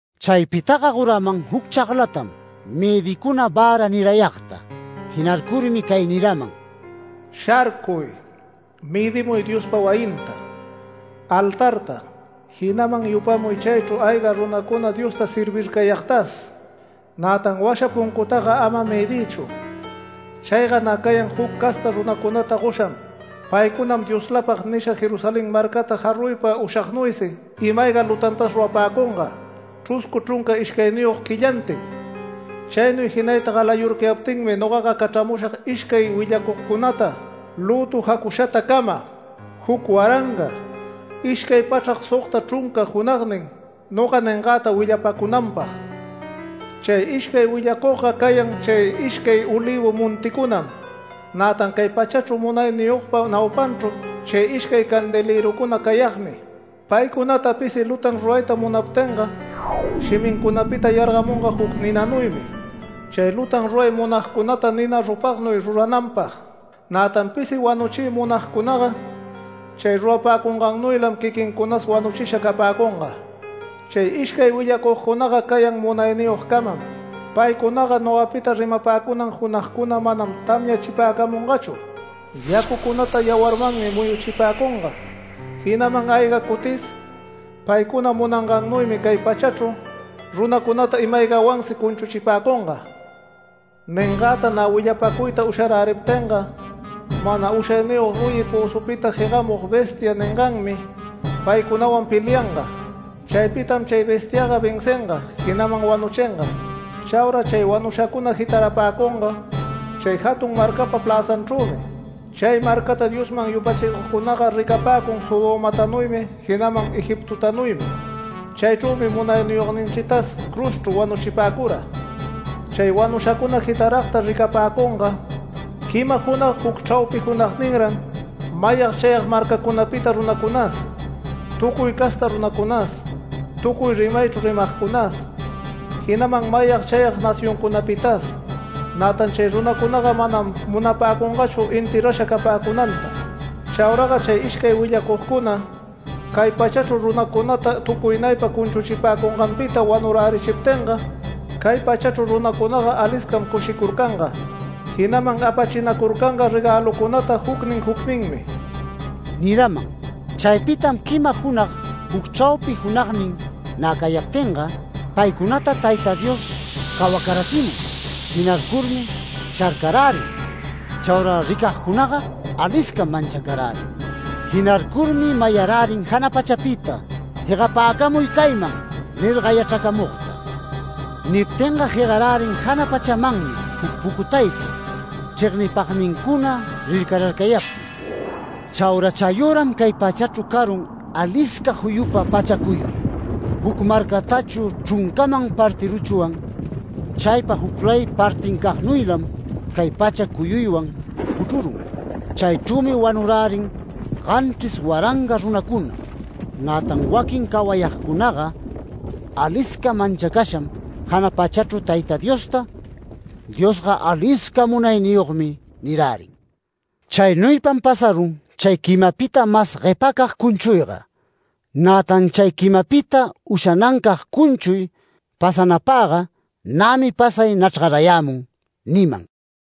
Chaypitaga goraman juc chaglatam mëdicuna vära nirayagta. Jinarcurmi cay niraman: “Sharcuy. Mëdimuy Diospa wayinta, altarta, jinaman yupamuy chaychru ayga runacuna Diosta servircayagtas. Nätan washa puncutaga ama mëdiychu. Chayga nä cayan juc casta runacunata gosham. Paycunam ‘Dioslapag’ nisha Jerusalén marcata jaruypa ushagnuysi ima-ayga lutantas rurapäcunga, chruscu chrunca ishcayniyog quillantin. Chaynuy jinayta galayurcayaptinmi nogaga cachramushag ishcay willacugcunata lütu jacushatacama, juc waranga ishcay pachrac sogta chrunca junagnin noga ningäta willapacunanpag. Chay ishcay willacugga cayan chay ishcay olïvu monticunam, nätan cay pachachru munayniyogpa naupanchru chay ishcay candelërucuna cayagmi. Paycunata pisi lutan rurayta munaptinga shimincunapita yargamunga juc ninanuymi chay lutan ruray munagcunata nina rupagnuy rurananpag. Nätan pisi wanuchiy munagcunaga chay rurapäcungannuylam quiquincunas wanuchisha capäcunga. Chay ishcay willacugcunaga cayan munayniyogcamam. Paycunaga nogapita rimapäcunan junagcuna manam tamyachipäcamungachu, yacucunata yawarmanmi muyuchipäcunga, jinaman ayga cutis paycuna munangannuymi cay pachachru runacunata ima-aygawansi cunchuchipäcunga. Ningäta nä willapacuyta usharäriptinga mana ushayniyog ruyi pözupita jegamug ‘bestia’ ninganmi paycunawan pelianga. Chaypitam chay bestiaga vencinga, jinaman wanuchinga. Chaura chay wanushacuna jitarapäcunga chay jatun marcapa pläzanchrümi. Chay marcata Diosman yupachicugcunaga ricapäcun Sodomatanuymi jinaman Egiptotanuymi. Chaychrümi munayniyogninchitas cruzchru wanuchipäcura. Chay wanushacuna jitaragta ricapäcunga quima junag juc chraupi junagninran mayag chayag marcacunapita runacunas, tucuy casta runacunas, tucuy rimaychru rimagcunas, jinaman mayag chayag nacioncunapitas. Nätan chay runacunaga manam munapäcungachu enterrasha capäcunanta. Chauraga chay ishcay willacugcuna cay pachachru runacunata tucuynaypa cunchuchipäcunganpita wanurärichiptinga, cay pachachru runacunaga aliscam cushicurcanga, jinaman apachinacurcanga regälucunata jucnin jucninmi” niraman. Chaypitam quima junag juc chraupi junagnin nä cayaptinga, paycunata Tayta Dios cawacarachimun. Jinarcurmi sharcarärin. Chaura ricagcunaga aliscam manchacarärin. Jinarcurmi mayarärin jana pachapita “Jegapäcamuy cayman” nir gayachracamugta. Niptinga jegarärin jana pachamanmi juc pucutaychru, chregnipagnincuna rircararcayaptin. Chaura chayüram cay pachachru carun alisca juyupa pacha cuyuy. Juc marcatachu chruncaman partiruchwan, chaypa juclay partincagnuylam chay pacha cuyuywan juchrurun. Chaychrümi wanurärin ganchris waranga runacuna. Nätan waquin cawayagcunaga alisca manchacasham jana pachachru Tayta Diosta “Diosga alisca munayniyogmi” nirärin. Chaynuypam pasarun chay quimapita mas guepacag cunchuyga. “Nätan chay quimapita ushanancag cunchuy pasanapaga nämi pasay nachrgarayämun” niman.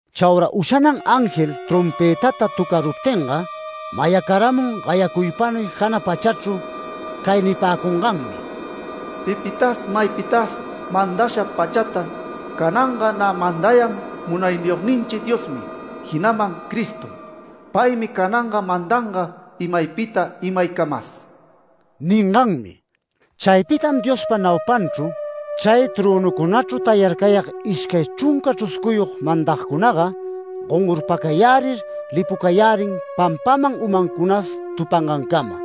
Chaura ushanan ángel trompëtata töcaruptinga, mayacaramun gayacuypanuy jana pachachru cay nipäcunganmi: “Pipitas maypitas mandasha pachata, cananga nä mandayan Munayniyogninchi Diosmi, jinaman Cristom. Paymi cananga mandanga imaypita imaycamas” ninganmi. Chaypitam Diospa naupanchru, chay trönucunachru tayarcayag ishcay chrunca chruscuyog mandagcunaga gongorpacayärir lipucayärin pampaman umancunas tupangancama.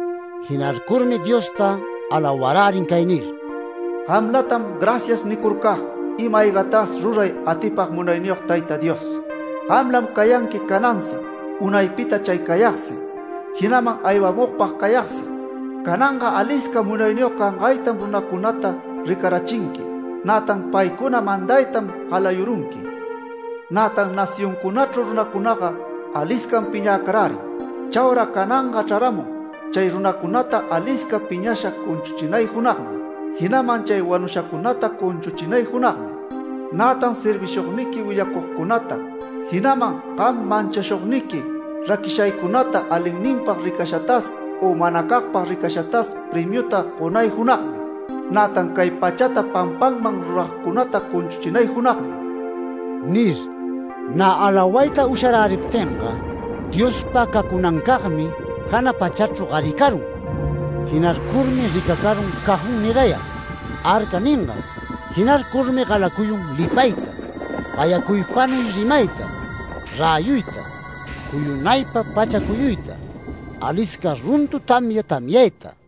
Jinarcurmi Diosta, alawarärin cay nir: “Gamlatam ‘Gracias’ nicurcag ima-aygatas ruray atipag munayniyog Tayta Dios. Gamlam cayanqui canansi, unaypita chay cayagsi, jinaman aywamugpag cayagsi. Cananga alisca munayniyog cangaytam runacunata ricarachinqui, nätan paycuna mandaytam galayurunqui. Nätan nacioncunachru runacunaga aliscam piñäcarärin. Chaura cananga chraramun chay runacunata alisca piñasha cunchuchinay junagmi, jinaman chay wanushacunata cunchuchinay junagmi, nätan servishugniqui willacugcunata, jinaman gam manchacushugniqui raquishaycunata, alinninpag ricashatas u manacagpag ricashatas premiuta gonay junagmi, nätan cay pachata pampanman ruragcunata cunchuchinay junagmi” nir. Nä alawayta usharäriptinga Diospa cacunancagmi jana pachachru garicarun. Jinarcurmi ricacarun cajón nirayag ‘Arca’ ningan. Jinarcurmi galacuyun lipayta, gayacuypanuy rimayta, räyuyta, juyunaypa pacha cuyuyta, alisca runtu tamya tamyayta.